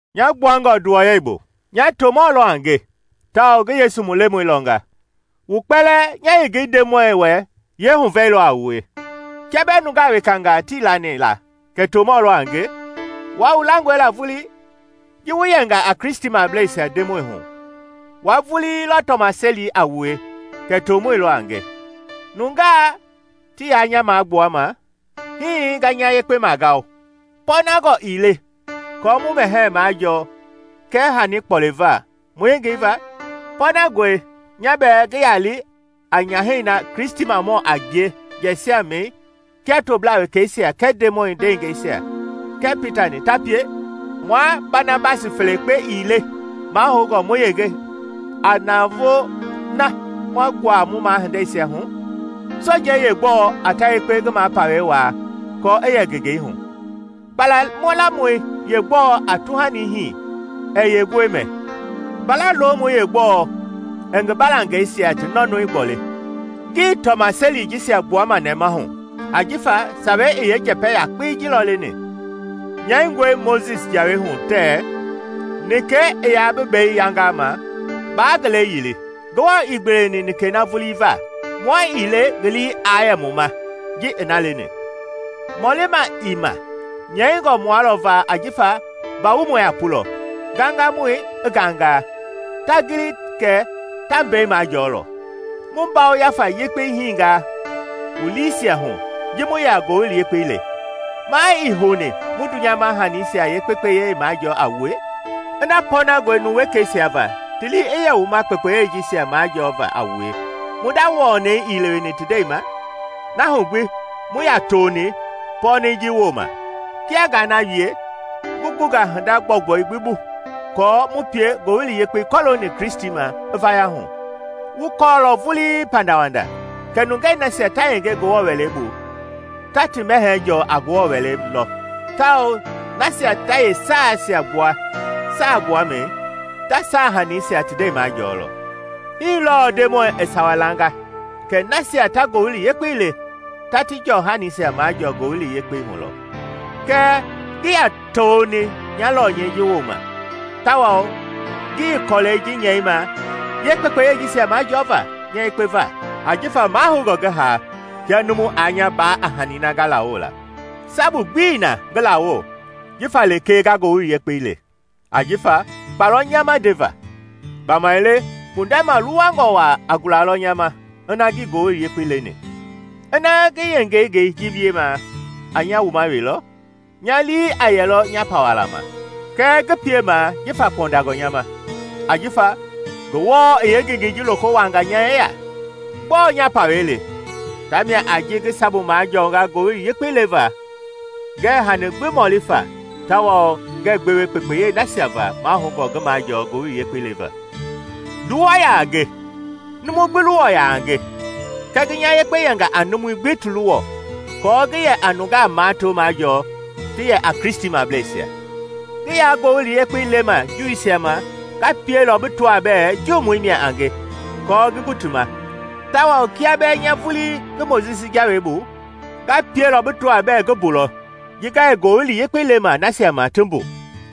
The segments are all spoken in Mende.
Nya gbuangɔ nduwɔyɛi bu, nya tomɔ lɔ a nge tawao ngi Yesu mu Lemɔi lɔnga. Wu kpɛlɛɛ nya yengei Ndemɔi wɛ yeehuvɛi lɔ a wie. Kia bɛɛ nungaa wekangaa tii lani la kɛ tomɔ lɔ a nge, wua wu langɔe la vulii! Ji wu yɛnga a Kristimableisia Ndemɔi hu, wua vulii lɔ tɔmaseli a wue kɛ tomɔi lɔ a nge. Nungaa ti yaa nya magbuama, hii nga nya yekpe magao. Pɔɔnangɔ ii le kɔɔ mu mɛhɛɛ majɔɔ kɛɛ hani kpɔliva mu yengei va? Pɔɔnangɔe nya bɛɛ ngi ya li a nyahɛi na Kristimamɔ a ngie jiɛisiamii kia toblaa wekeisia kɛɛ Ndemɔi ndeengɛisia kɛɛ Pita-ni ta pie? Mua Banabasi felekpe ii le mahoungɔ mu yenge navoo ma nguava mu mahindeisia hu? Sojei yeegbɔɔ a ta yekpe ngi mapawɛi waa kɔɔ i yɛ ngi yengei hu? Kpalamɔi yegbɔɔ a tuhani hii ɛɛ yeenguɛi mɛ? Mbala lomɔi yeegbɔɔ ɛɛ ngi baalangɛisia ti nɔnɔi gboli? Ngii tɔmaseli jisia gbuama nɛmahu ajifa Sawei i yeenjɛpɛ yakpei ji lɔ leni. Nyɛingɔe Mojisi Jawei hu tɛɛ, “Nikɛi i yaa bi bei yangama, baa ngi lɛi yili.” Ngewɔ ii gbeweni nikɛi na vulii va? Mua ii le ngi lii aa yɛ mu ma ji i na leni? Mɔlima ii ma, nyɛingɔ mua lɔ va ajifa mba-wumɔi a pulɔ, ngangamɔi i nganga, ta gili kɛ ta mbei majɔɔlɔ. Mu ngafa yekpei hinga wu liisia hu ji mu yɛ a ngowili yekpei le. Maa ii houni mu dunyama hanisia yeekpekpeyei majɔɔ a wue? Ina pɔɔnangɔe numu wekeisia va ti lii i yɛ wu ma kpekpeyei jisia majɔɔva a wue mu nda wɔnɛi ii leweni ti ndɛi ma? Na hu gbi mu yaa toni i pɔɔnɛi ji wooma. Kia ngaa na wie, ngi gunga hinda gbɔugbɔi gbi bu aako mu pie Ngowili Yekpei kɔlooni Kristi ma i vaya hu. Wu kɔɔlɔ vulii pandawanda kɛ nungei nasia ta yenge Ngewɔ Wɛlei bu ta ti mɛhɛɛ jɔɔ a Ngewɔ Wɛlei lɔ tawao nasia ta yeesaaisia gbua saagbuamɛi, ta saahaniisia ti ndɛi majɔɔlɔ. Hii lɔɔ Ndemɔi i sawa langa kɛ nasia ta Ngowili Yekpei le ta ti jɔɔ hanisia majɔɔ Ngowili Yekpei hu lɔ. Kɛɛ ngii yaa toni nya lɔnyɛi ji wooma tawao ngii kɔlɛi ji nyɛima yeekpekpeyei jisia majɔɔva nya yekpe va. Ajifa mahoungɔ ngi haa kia numu aa nya baa a hani na nga lawoo la. Sabu gbii na ngi lawo jifa lekee nga Ngowili Yekpei le; ajifa kpa lɔ nya ma ndeva. Gbamaile kpundɛ maluwangɔ waa a gulalɔ nya ma ina ngii Ngowili Yekpei leni! Ina ngi yeengengei ji wiema a nya wuma we lɔ, nya lii aa yɛlɔ nya pawala ma; kɛɛ ngi piemaa jifa kpɔndangɔ nya ma, ajifa Ngewɔ i yeengengei ji loko wuaanga nya yeya. Gbɔɔ nya pawɛi le? Tamia a ji ngi sabu majɔɔnga Ngowili Yekpei leva ngɛɛ hani gbi mɔli fa tawao ngɛɛ gbewe kpekpeyei nasia va mahoungɔ ngi majɔɔ Ngowili Yekpei leva. Nduwɔ yaa nge, numu gbi luwɔ yaa a nge; kɛɛ ngi nya yekpe yɛnga a numui gbi ti luwɔ aako ngi yɛ a nungaa mato majɔɔ ti yɛ a Kristimableisia. Ngi yaa Ngowili Yekpei lema Juuisia ma nga pielɔ bi tɔaa bɛɛ Juumɔi mia a nge aako ngi gu ti ma; tawao kia bɛɛ nya vulii ngii Mojisi Jawei bu, nga pielɔ bi tɔaa bɛɛ ngi mbu lɔ ji nga yɛ Ngowili Yekpei lema nasia ma ti mbu,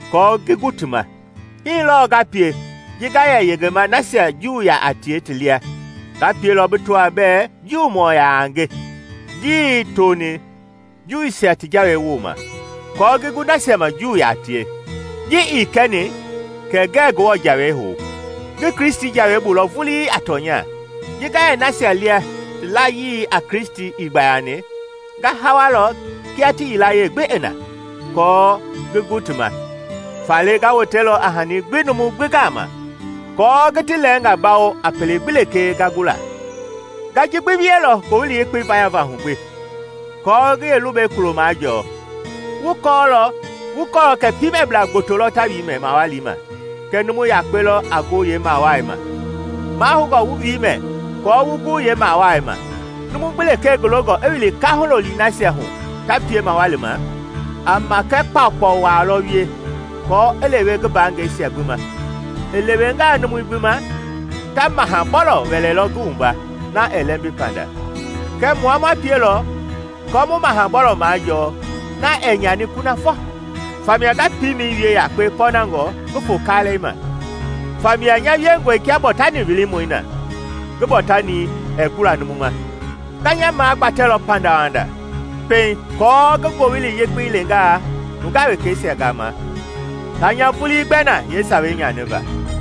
aako ngi gu ti ma. Hii lɔɔ nga pie ji nga yɛ yengema nasia Juu yaa tie ti lia, nga pielɔ bi tɔaa bɛɛ Juumɔ yaa nge, ngii toni Juuisia ti Jawei wooma, aako ngi gu nasia ma Juumɔ yaa tie. Ji ii kɛni kɛ ngɛɛ Ngewɔ Jawei hou; ngi Kristi jawei bu lɔ vulii a tɔnya. Ji nga yɛ nasia lia ti layii a Kristi ii gbayani, nga hawalɔ kia ti yilayee gbi i na, aako ngi gu ti ma. Faale nga wotelɔ a hani gbi numu gbi gama, aako ngi ti lɛɛnga bawo a pele gbi lekee nga gu la. Nga ji gbi wielɔ Ngowili Yekpei vayava hu gbi, aako ngi yeelubɛi kulo majɔɔ. Wu kɔɔlɔ kɛ piimɛblaa gboto lɔ ta wiimɛ mawali ma kɛɛ numu yakpe lɔ a gu yeemawaai ma. Mahoungɔ wu wiimɛi aako wu gu yeemawai ma. Numu gbi lekee ngi longɔ i wili kaahu-looli nasia hu ta pie mawali ma, a makɛ kpaukpau waa lɔ wie aako i lewe ngi mbaangɛisia gbi ma. I lewengaa numui gbi ma, ta maha-bɔlɔ wɛlɛlɔ ngi wumba na ɛɛ lɛmbi panda. Kɛɛ mua ma pielɔ aako mu maha-bɔlɔ majɔɔ na ɛɛ nyani kunafɔ. Famia nga piimɛi wie yakpe pɔɔnangɔ ngi fo kalɛi ma; famia nya wiengɔ kia bɔɔtani wilimɔi na ngi bɔɔtani ɛɛ gbula numu ma. Nga nya magbatɛlɔ pandawanda pɛiŋ aako ngi ngowili yekpei leengaa nungaa wekeisia gama, taa nya vulii gbɛ na yeesawei nyaniva.